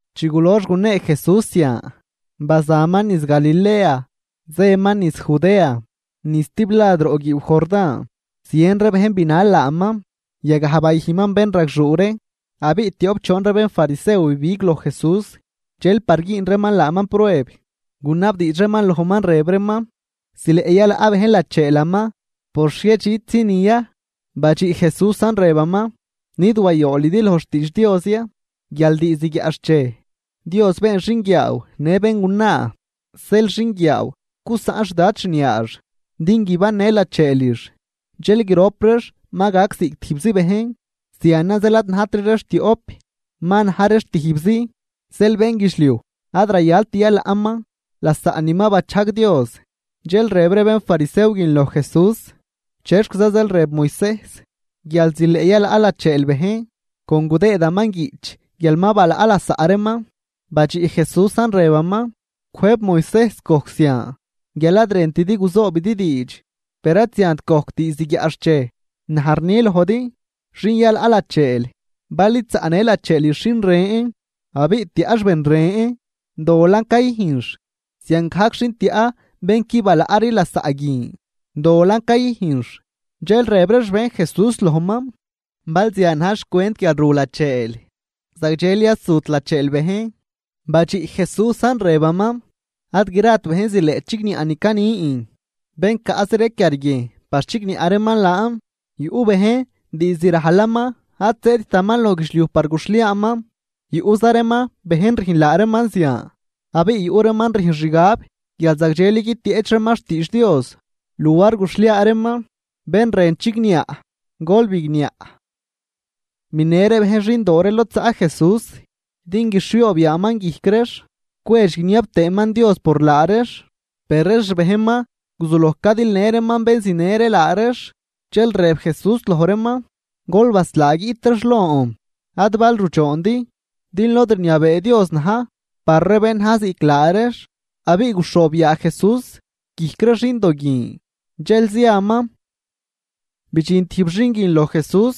Chi gulox gunee Jesús zian, bazaman niz Galilea, zëman niz Judea, niz stiblad roꞌ guiiw Jordán. Zien ree bejn binal laaman, yagaj bayüjnman bénragxuu ree. Abiꞌ tioꞌp choon ree bénfarisew bibig loj Jesús, dxel par güün reeman laaman prueb, gunabdiidx reeman lojman rëb reeman: ―¿Zileꞌ yalaꞌ bejn lacheelaman por xhiedxitzinin ya? Badxiꞌ Jesúsan rëbaman: ―¿Nid wayoolidi loj xtiidx Dios ya, guial diizd guiaꞌxchej Dios “been xinguiaaw në béngunaa”? Rëb tëëman: “Zeel xinguiaaw gusaꞌn xdad xniaax din guibannë lacheelix, dxel grop reex ma gac ziꞌc tijbzi bejn.” Zianan zeel ad najtri reex tioꞌp, ma na̱j reex tijbzi. Zeel bénguidxliuj ad rayalt yalaꞌman lasaꞌ ni ma bachajg Dios. Dxel rëb ree bénfarisew guin loj Jesús: ―¿Chexquiza zeel rëb Moisejs guial zileꞌ yalaꞌ lacheel bejn, con gudëëdaman guiꞌch guial ma balaꞌ lasaꞌ reeman? Badxiꞌ Jesúsan, rëbaman: ―Cwëjb Moisejs gojc zian guial ad rëntidi guzoobidi diidx, per ad ziant gojc diizd guiaꞌxchej. Naj rni lojdi. Xin yalaꞌ lacheel, bal id zaꞌnë lacheelix xin ren, abiꞌ tiaꞌx ben ren dolan cayüjnx. Ziangajc xin tiaꞌ bén qui balaꞌri lasaꞌ guin dolan cayüjnx. Dxel rëb ree xbejn Jesús lojman: ―Bal zian na̱j xcwent guial ru lacheel, zagdxeli ad zut lacheel bejn Badxiꞌ Jesúsan rëbaman: ―Ad grat bejn zileꞌ chigniaꞌ ni canin, bén caꞌzi ree quiarguiejn par chigniaꞌ reeman laan. Yuꞌ bejn diizd rajlaman ad zëëdtaman loj guidxliuj par guxhliaaman, yuꞌza reeman, bejn rüjn laa reeman zian. Abiꞌ yuꞌ reeman rüjn xgab guial zagdxeli guitieꞌch reeman xtiidx Dios luar guxhliaa reeman. Bén rën chigniaꞌ, gol bigniaꞌ. Binë ree bejn xindoo ree lod zaꞌ Jesús, din guixhioob yaaman guijc reex cwedx guiniab tëëman Dios por laa reex, per ree xbejnman guzuloj cadilë reeman bén zinë ree laa reex. Dxel rëb Jesús loj reeman: ―Gol baslaa guiꞌt reex lon, ad bal rudxoondi, din lod rniabee Dios na̱j par ree bén naj ziꞌc laa reex. Abiꞌ guxhoob yaa Jesús guijc ree xindo guin, dxel ziaman. Bidxin tijb xin guin loj Jesús,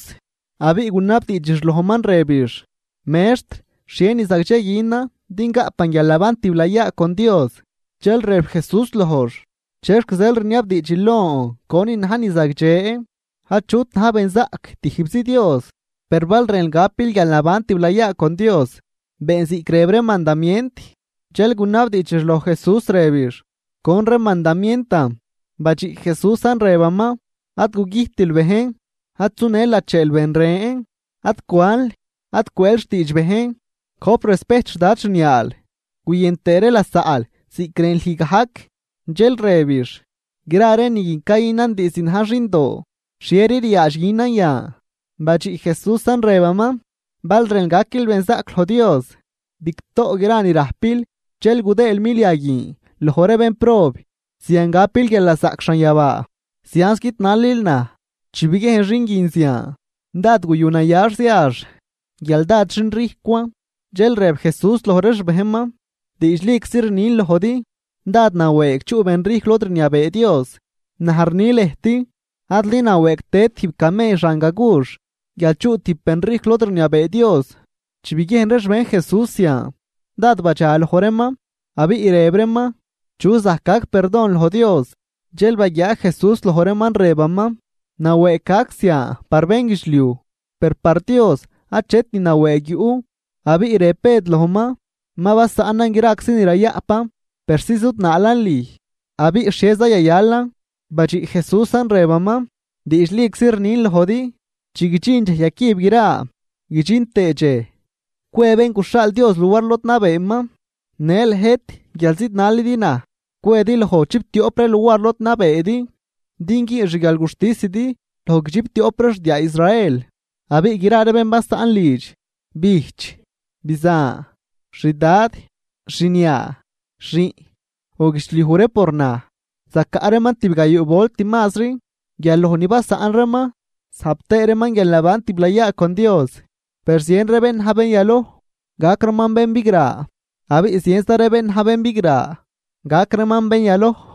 abiꞌ gunabdiidxix lojman, rëbix: ―Mextr, ¿xhie ni zagdxe günan din gaꞌpan guialnaban tiblayaa con Dios? Dxel rëb Jesús lojx: ―¿Chexc zeel rniabdiidxil lon conin na̱j ni zagdxe? Achut na̱j benzaꞌc, tijbzi Dios. Per bal rënl gapil guialnaban tiblayaa con Dios, been ziꞌc rëb ree mandamient. Dxel gunabdiidxix loj Jesús rëbix: ―¿Con ree mandamientan? Badxiꞌ Jesúsan, rëbaman: ―Ad gugüjtil bejn, ad sunël lacheel ben ren, ad cwanl, ad cwëël xtiidx bejn, gojp respejt xdad xniaal, guyën tëë ree lasaꞌl ziꞌc rën lüj gajc. Dxel rëbix: ―Gra ree ni guin cayünan diizd najn xindoo, ¿xhieri ryaadx günan yan? Badxiꞌ Jesúsan, rëbaman: ―Bal rënl gaquil benzaꞌc loj Dios, bigtoꞌ gra ni rajpil dxel gudëël milia guin loj ree bénprob. Zian gapil guialnazaꞌc xanyabaa. Zianz guidnalil naj. Chi biguiejn xin guin zian, dád guyu nayax ziax, guial dád xinrijcwan. Dxel rëb Jesús loj ree xbejnman: ―Diidxliczi rnin lojdi: Dád nawëëg chuꞌ benrijcw lod rniabee Dios. Naj rni lëjt. Adli nawëëgt tëd tijb camell xan gagux, guial chuꞌ tijb benrijcw lod rniabee Dios. Chi biguiejn ree xbejn Jesús zian, dád badxaloj reeman, abiꞌ rëb reeman: ―¿Chuza zajc gac perdon loj Dios? Dxel baguiaa Jesús loj reeman, rëbaman: ―Nawëëg gac zian par bénguidxliuj, per par Dios achet ni nawëëg yuꞌ. Abiꞌ rëb Bëd lojman: ―Ma basaꞌnan graczi ni rayaꞌpan, persi zudnaalan lüj. Abiꞌ ¿xhieza yayalan? Badxiꞌ Jesúsan, rëbaman: ―Diidxliczi rnin lojdi chi guidxin dxej yacüb gra, guidxin tëë dxej cwe Bén guxhaal Dios luar lod nabeeman, në lëjt, guial zidnalidi naj, cwedi loj chiptioꞌp ree luar lod nabeedi, din güün xguialguxtisidi loj guidxiptioꞌp ree xdiaa Israel. Abiꞌ gra ree bén basaꞌn lidx, bijch, bizan, xdad, xniaa, xiꞌn, o guidxliuj ree por naj, zacaꞌ reeman tibgayuu volt mazri guial loj ni basaꞌn reeman, zajp tëë reeman guialnaban tiblayaa con Dios. Per zien ree bén na̱j bén yaloj, gac reeman bén bigra, abiꞌ zienza ree bén na̱j bén bigra, gac reeman bén yaloj.